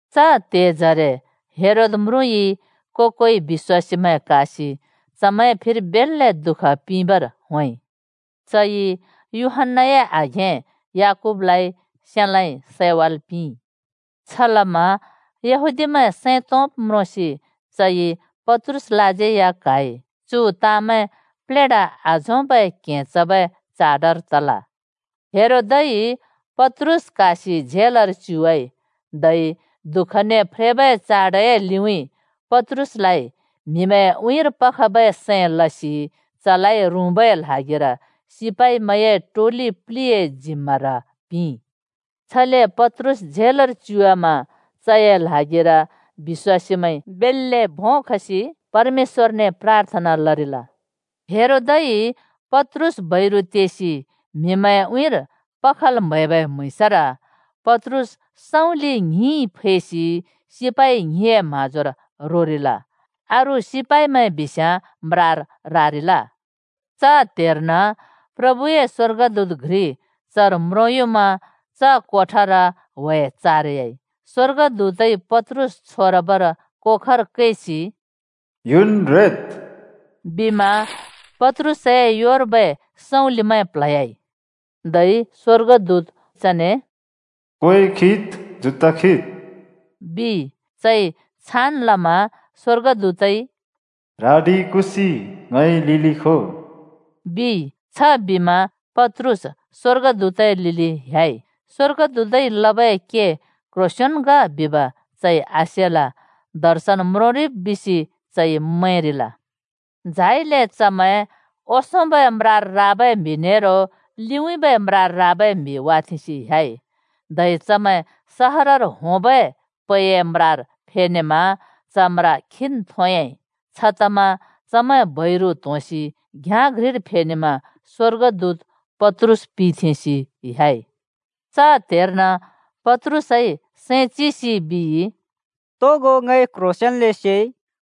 च त्हेजरे हेरोद म्रुँइ को-कोइ बिश्‍वासीमैं क्हासि चमैंए फिर बेल्‍ले दुःख पिंबर होंइ। चइ यूहन्‍नाए आघें याकूबलाइ सेलाँइ (तरवारइ) सैवाल् पिंइ। छलमा यहूदीमैं सैं तोंब् म्रोंसि चइ पत्रुसलाज्यै या क्हाइ। (चु ताँमैं प्लेढा आझोंबै क्हें चबै चाडर तल।) हेरोदइ पत्रुस क्हासि झेलर च्युवाइ, धै दुःखने फ्रेबै चाडए लिउँइँ पत्रुसलाइ म्हिमैंए उँइँर पखबै सैं लसि चलाइ रुँबै ल्हागिर सिपाइमैंए टोलि प्लिए जिम्मार पिंइ। छले पत्रुस झेलर च्युवामा चए ल्हागिर बिश्‍वासीमैंइ बेल्‍ले भों खसि परमेश्‍वरने प्राथना लरिल। हेरोदइ पत्रुस बैरु तेसि म्हिमैंए उँइँर पखल् म्हैबै म्हुँइँसर पत्रुस सँउँलि ङ्हिंइ फैसि सिपाइ ङ्हिंए म्हाँजोर रोरिल। धै अरू सिपाइमैं या झेलए म्राए ओंसों रूँरिल। च त्हेर्न प्रभुए स्‍वर्गदूत घ्रि चर म्रोंयुमा च कोठर व्हे-व्हे तयाइ। स्‍वर्गदूतइ पत्रुस छोरबर कोखर कैसि “युनन् रेद्!” बिमा पत्रुसए योमैंउँइँले सँउँलि प्ल्हयाइ। धै स्‍वर्गदूतजी चने “क्वें खिद्, जुत्ता खिद्!” बिइ। चइ छान् लमा स्‍वर्गदूतइ “ह्रडि कुसि ङए लिलि खो!” बिइ। छबिमा पत्रुस स्‍वर्गदूतए लिलि ह्‍याइ। स्वर्गदूतइ लबै के क्ह्रोंसेंन् ग बिब चइ आसेल। दर्शन म्रोंरिब् बिसि चइ मैंरिल। झाइले चमैं ओंसोंबै ने अर्को रुँबर टिबै म्हिमैं वाथेंसि ह्‍याइ। धै चमैं सहरर होंबै पैए म्रार फेनेमा च म्रा खीन् थोंयाँइ। छतमा चमैं बैरु त्होंसि घ्याँ घ्रिर फेनेमा स्वर्गदूत पत्रुस पिथेंसि ह्‍याइ। च त्हेर्न पत्रुसइ सैं चिसि बिइ, “तोगो ङइ क्ह्रोंसेंन्‍ले सेइ,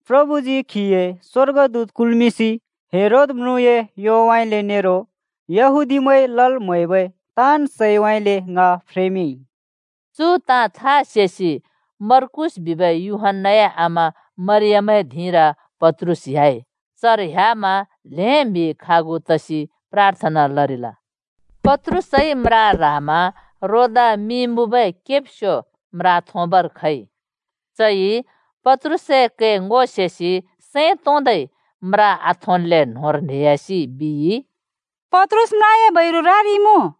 प्रभुजी खीए स्‍वर्गदूत कुल्मिंसि हेरोद म्रुँए योउँइँले नेरो यहूदीमैंइ लल् म्हैबै ताँन् सैउँइँले ङ फ्रेमिंइ।” चु ताँ था सेसि पत्रुस मर्कूस बिबै यूहन्‍नाए आमा मरियमए धिंर ह्‍याइ। चर ह्‍यामा ल्हें म्हि खागु तसि प्राथना लरिल। पत्रुसइ म्रा ह्रामा रोदा मिं मुँबै केब्स्यो म्रा थोंबर खइ। चइ पत्रुसए कै ङो सेसि सैं तोंदै म्रा आथोंल्‍ले न्होंर न्हेह्‍यासि बिइ, “पत्रुस म्राए बैरु रारिइमुँ!”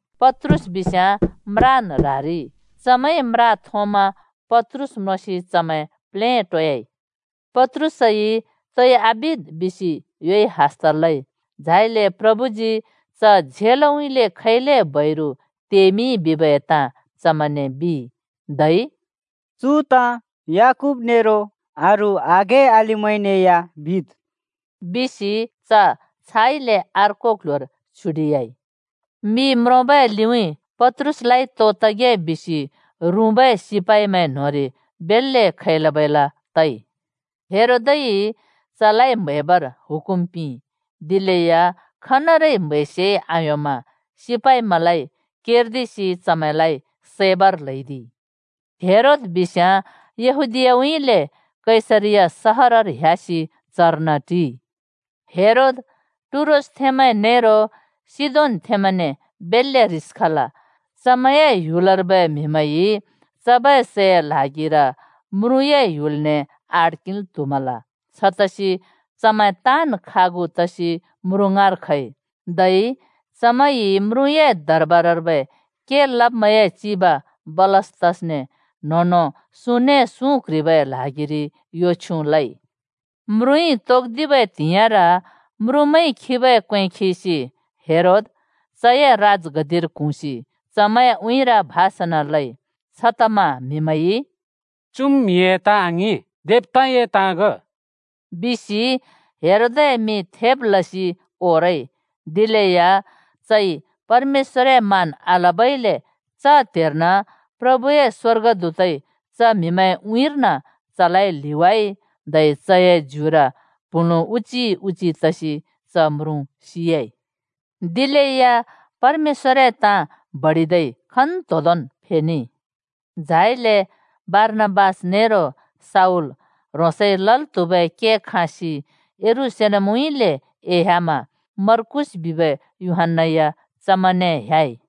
पत्रुस बिस्याँ म्रान् ह्रारिइ। चमैंइ म्रा थोंमा पत्रुस म्रोंसि चमैं प्लेटोयाइ। पत्रुसइ तोइ आबिद् बिसि योइ हस्त लइ, झाइले प्रभुजी च झेलउँइँले खैले बैरु तेमिंइ बिबै ताँ चमैंने बिइ। धै “चु ताँ याकूब नेरो अरू आघें-अलिमैंने या बिद् ओ,” बिसि च छाइले अर्को क्ल्ह्‍योर छ्युडिह्‍याइ। मि म्रोंबै लिउँइँ पत्रुसलाइ तो तगे बिसि रुँबै सिपाइमैं न्होंरि बेल्‍ले खैला-बैला लइ। हेरोदइ चलाइ म्हैबर हुकुम पिंइ। दिलेया खनरै म्हैसे आयोंमा सिपाइमैंलाइ केर्दिसि चमैंलाइ सैबर ल्हैदिइ। हेरोद बिस्याँ यहूदीयाउँइँले कैसरिया सहरर ह्‍यासि चर्न टिइ। हेरोद टुरोसथेंमैं नेरो सिदोनथेंमैने बेल्‍ले ह्रिस खल। चमैंए ह्‍युलर्बै म्हिमैंइ चबै सैए ल्हागिर म्रुँए ह्‍युलने आड किंल् त्हुमल। छतसि चमैं ताँन् खागु तसि म्रुँ ङाँर खइ, धै चमैंइ म्रुँए दरबारर्बै के लब्मैंए चिब बलस्तसने न्हों-न्हों सुँने सुँ क्ह्रिबै ल्हागिरि यो छ्युँ लइ। म्रुँइ त्हाँबै त्हिंइर म्रुँमैंइ खिबै क्वें खिसि हेरोद चए राजगद्दिर क्हुँसि चमैंए उँइँर भाषण लइ। छतमा म्‍हिमैंइ “चुम् म्हिए ताँ आङिं! देवताए ताँ ग!” बिसि हेरोदए मिं थेब् लसि ओरइ। दिलेया चइ परमेश्‍वरए मान आलबइले च त्हेर्न प्रभुए स्वर्गदूतइ चम्हिमैंए उँइँरलाइ ल्हिवाइ धै चए ज्युर प्हुँलुँ उजी उजी तसि च म्रुँ सियाइ। दिलेया परमेश्‍वरए ताँ बडिदै खन्‍तोंदोंन् फेनेइ। झाइले बारनाबास नेरो शाऊल ह्रोंसइ लल् त्हुबै के खाँसि यरूशलेमउँइँले एह्‍यामा मर्कूस बिबै यूहन्‍ना या चमैंने ह्‍याइ।